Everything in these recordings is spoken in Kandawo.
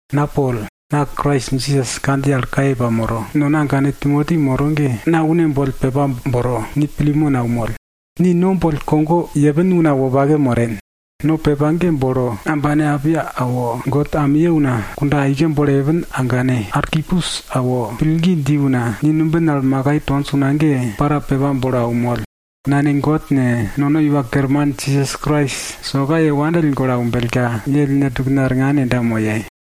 Na Pol, na Krais Jisas kandjiye al kaye pamoro, nono agane Timoti moro ge, na une boll pepa bolo ni Pilemon aunmoll. Ni no boll kogo aike yepin una wopake moren. No pepa ge bolo ambane Apia awo, God amiye una kunda aike bolo yepin agane Arkipus awo, pillgi dji una ni numbin al makai tonj una ge para pepa bolo aunmoll. Nane God ne, nono Iwa Kerman Jisas Krais, soka ye wopake pille aumbellka, ye ellne tukne arngan yenda moye.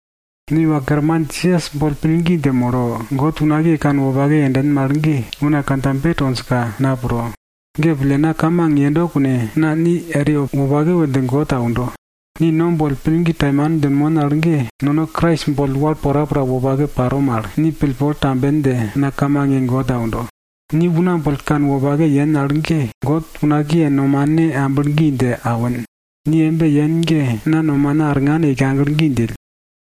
Ni Iwa Kerman Jisas boll pillgi dje molo, God unakiye kanwopake yenden mal ge, una kandjabe tonjka na pro. Ge pille na kamang yendo kune, na ni eri wopake we dje God aundo. Ni no boll pillgi taimane djinmon al ge, nono Krais boll wal porapora wopake paro mal, ni pillpol tamben dje na kamang ye God aundo. Ni una boll kanwopake yen al ge, God unakiye nomane amblo gi dje awin. Ni embe yen ge na nomana arngan yeika aglo gi djill.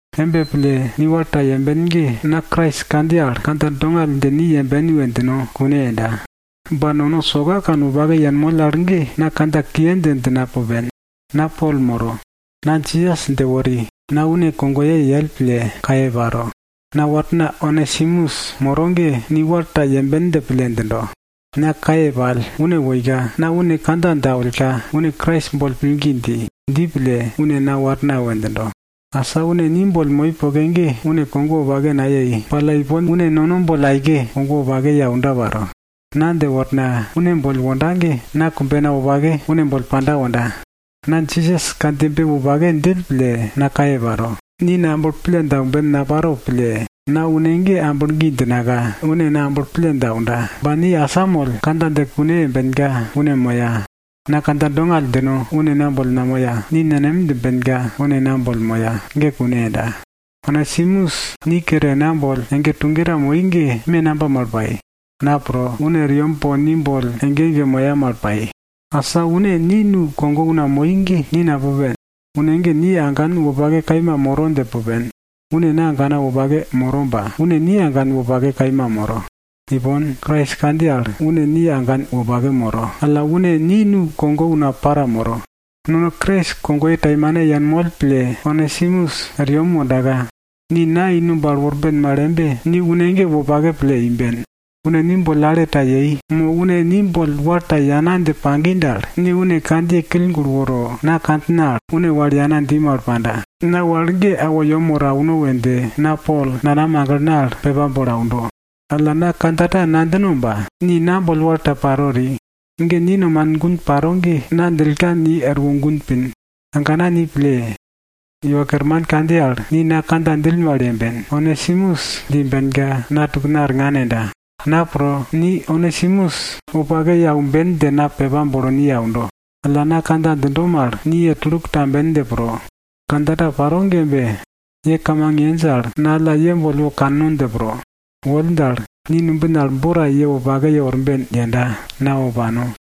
Embe pille ni wal ta yemben ge, na Krais kandjiye al kandja dongall dje ni yemben we djino kune yenda. Ba nono soka kanwopake yenmoll al ge na kandja kiye dje djina pupen. Na Pol moro, na Jisas dje wori na une kogoye yell pille kaye paro. Na warna Onesimus moro ge ni wal ta yemben dje pille djindo. Na kaye pall, une woika, na une kandja dje awillka une Krais boll pillgi dji. Dji pille, une na warna we djindo. Asa une ni boll moi poke ge, une kogo wopake nayei. Ba alla ipon, une nono boll aike kogo wopake ye aunda paro. Na dje worna une ni boll wonda ge na kumbena wopake une boll panda wonda. Na Jisas kandjiyebe wopake djill pille na kaye paro, ni na amblo pille dje aumben naparo pille, na une ge amblo gi djinaka une na amblo pille dje aunda. Ba, ni asamoll kandja dje kune yembenka une moya. Na kandja dongall djino une na boll namoya, ni nenem djimbenka une na boll moya, ge kune yenda. Onesimus ni kere na boll ege tuge ta moi ge me namba mal pai? Na pro, une er yem po ni boll ege ege moya mal pai. Asa une ni nukogo una moi ge, ni napupen. Une ge ni agan wopake kaima moro dje pupen. Une na agana wopake moro ba une ni agan wopake kaima moro. Ipon, Krais kandjiye al une ni agan wopake moro, alla une ni nukogo una para moro. Nono Krais kogoye taimane yenmoll pille Onesimus er yem wondaka, ni na i numb al worben mal embe, ni une ge wopake pille imben. Une ni boll ale ta yei, mo une ni boll wal ta yana dje pagi dal, ni une kandjiye kill gulo woro na kandjina al une wal yana dji mal panda. Na wal ge awo yem woro auno we dje na Pol nanam aglena al pepa bolo aundo. Alla na kandja ta nadjino ba, ni na boll wal ta paro eri. Ge ni nomanin gun paro ge, na djillka ni erwo gun pin. Agana ni pille! Iwa Kerman kandjiye al, ni na kandja djill mal yemben, Onesimus dje imbenka, na tukna arngan yenda. Na pro, ni Onesimus wopake ye aumben dje na pepa bolo ni aundo. Alla na kandja djindo mal ni ye tuluk tamben dje pro. Kandja ta paro ge embe. Ye kamang yenj al, na alla ye boll wo kanno dje pro. Woll dal, ni numbin al bo ta ye wopake yeworben yenda, na wo pano.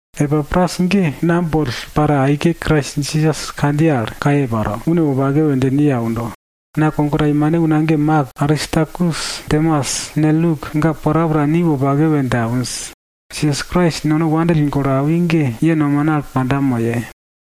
Epapras ge na boll para aike Krais Jisas kandjiye al kaye paro, une wopake we dje ni aundo. Na kogo taimane una ge Mak, Aristarkus, Demas ne, Luk ga porapora ni wopake we dje awinj. Jisas Krais nono wopake pille aundo ge, ye nomane al panda moye.